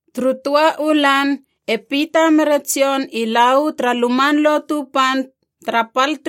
Turu töa u lan e Pita mere Jon i la uu tara Luman Lotu Pan tara pal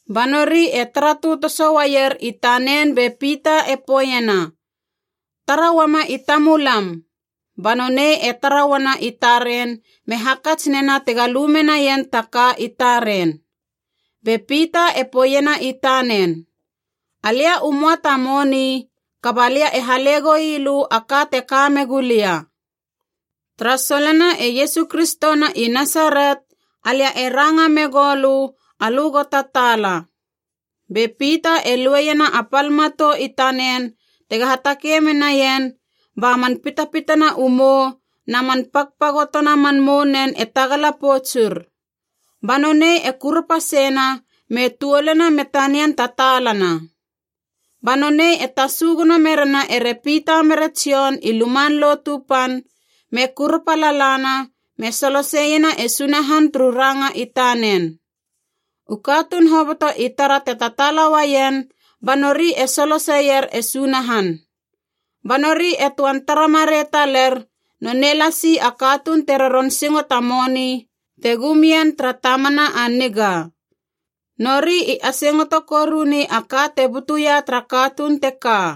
Ba nori e tara tötoso uaier i tanen be Pita e poeiena, “Tara uama i tamulam!” Ba nonei e tara uana i taren me hakats nena tega lu menaien ta ka i taren. Be Pita e poeiena i tanen, “Alia u möa ta moni, kaba lia e hale goilö a ka te ka megu lia. Tara solona e Iesu Kristo na i Nasaret, alia e ranga megou lö, alö go tataala!” Be Pita e lueiena a pal matou i tanen tega hatakei menien, ba man pitpitana u mou na man pagpagotona man mounen e tagala poutsur. Ba nonei e kurapa seina me tuoluna me tanian tataalana! Ba nonei e tasu gono merena ere Pita mere Jon i Luman Lotu Pan, me kurapa lalana me soloseiena e Sunahan turu ranga i tanen! U katuun hoboto i tara te tataala uaien ba nori e soloseir e Sunahan. Ba nori e töan tara marei taler nonei lasi a katuun te roron singo ta moni te gumien tara Tamana a Niga. Nori i asingoto koruni a ka te butuia tara katuun teka.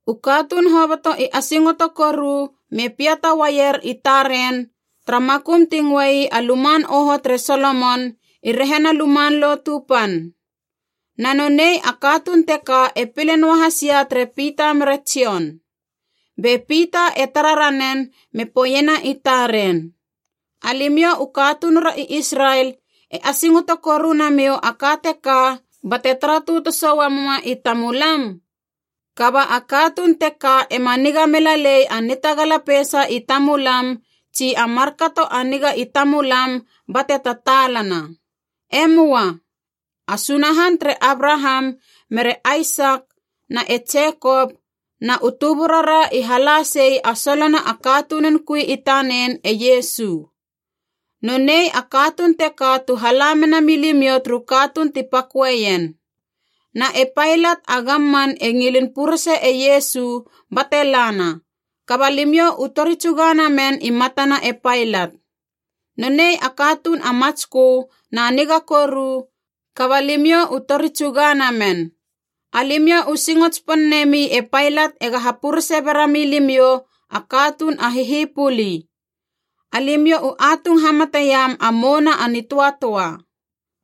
U katuun hoboto i asingoto koru me piata uaier i taren, tara makum ti ngöei a “Luman Oho tere Solomon” i rehina Luman Lotu Pan. Na nonei a katuun teka e pile noahas ia tere Pita mere Jon. Be Pita e tara ranen me poeiena i taren, “Alimiou u katunura i Israel e asingoto koru namiou a ka teka bate tara tötoso uamuma i tamulam? Kaba a katuun teka ema niga mela lei a nitagala peisa i tamulam tsi a markato a niga i tamulam bate tataalana. E möa. A Sunahan tere Abraham mere Aisak na e Jekop na u tuburara i hala sei a solona a katunun kui i tanen e Iesu. Nonei a katuun teka tu hala mena milimiou turu katuun ti paköeien. Na e Pailat a gamman e ngilin purese e Iesu bate lana, kaba limiou u tori tsuga namen i matana e Pailat. Nonei a katuun a matskö na niga koru, kaba limiou u tori tsuga namen. Alimiou u singo tsipon nemi e Pailat ega hapurese berami limiou a katuun a hihipuli. Alimiou u atung hamateiam a Mouna a Nitöatöa.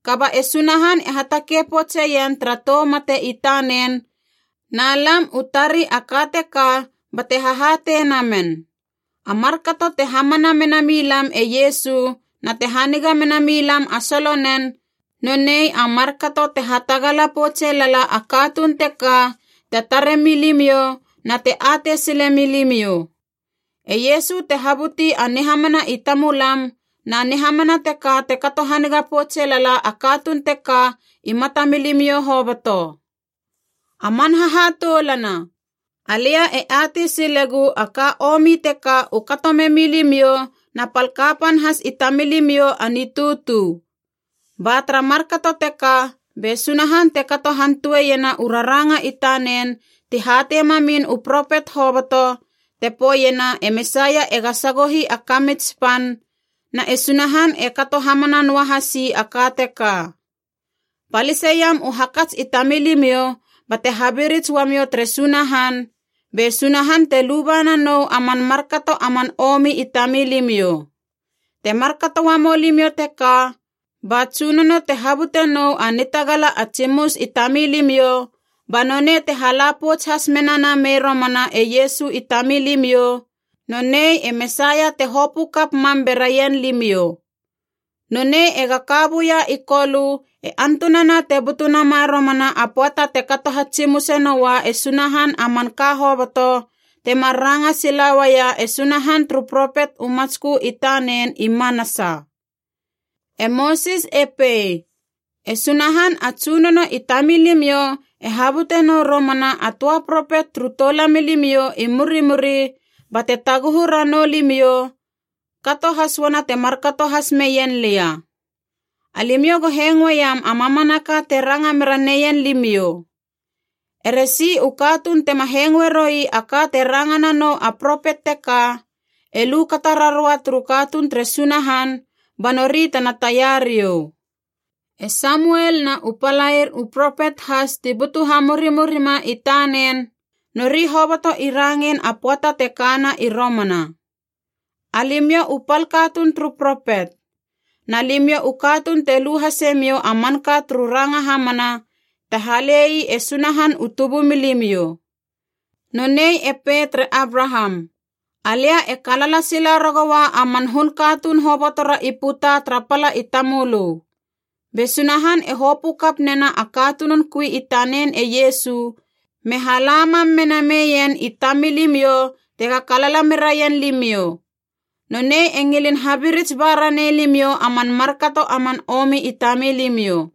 Kaba e Sunahan e hatakei poutseien tara tou mate i tanen, na lam u tari a ka teka bate hahatei namen. A markato te hamana mena milam e Iesu na te haniga mena milam a solonen, nonei a markato te hatagala poutse lala a katuun teka te tare milimiou na te atei sile milimiou. E Iesu te habuti a nihamana i tamulam, na nihamana teka te kato haniga poutse lala a katuun teka i matamilimiou hoboto. “A man hahatoulana, alia e atei silegu a ka omi teka u kato memi limiou na pal kapan has i tamilimiou a nitutu. Ba tara markato teka be Sunahan te kato hantoeiena u raranga i tanen ti hatei mamin u propet hoboto, te poeiena e Mesaia ega sagohi a kamits pan, na e Sunahan e kato hamana noa hasi a ka teka. Paliseiam u hakats i tamilimiou bate habirits ua miou tere Sunahan, be Sunahan te luba nanou a man markato a man omi i tamilimiou. Te markato uamou limiou teka, ba Tsunono te habute nou a nitagala a tsimus i tamilimiou, ba nonei te hala pouts has mena namei romana e Iesu i tamilimiou, nonei e Mesaia te hopö kap mam beraien limiou. Nonei ega ka buia i Kolö e antunana te butu nama romana a pöata te kato hatsimuse noa e Sunahan a man ka hoboto, temar ranga sila uaia e Sunahan turu propet u matskö i tanen i manasa. E Mosis e pei, ‘E Sunahan a Tsunono i tamilimiou e habute nou romana a töa propet turu toulamilimiou i murimuri bate taguhu ranou limiou, kato has uana te markato has meien lia. Alimiou go hengoeiam a mamanaka te ranga mera neien limiou. Ere si u katuun tema hengoe roi a ka te ranga nanou a propet teka, e lu kata raroua turu katuun tere Sunahan ba nori tena taia riou.’ “E Samuel na u palair u propet has ti butu hamurimurima i tanen, nori hoboto i rangein a pöata te kana i romana. Alimiou u pal katuun turu propet. Na limiou u katuun te lu hasemiou a manka turu ranga hamana te hale ii e Sunahan u tubumilimiou. Nonei e pei tere Abraham, ‘Alia e kalala sila ragoua a man hun katuun hobotora i puta tara pala i tamölö.’ Be Sunahan e hopö kap nena a katunun kui i tanen e Iesu, me hala mam mena meien i tamilimiou tega kalala meraien limiou. Nonei e ngilin habirits ba ranei limiou a man markato a man omi i tamilimiou.”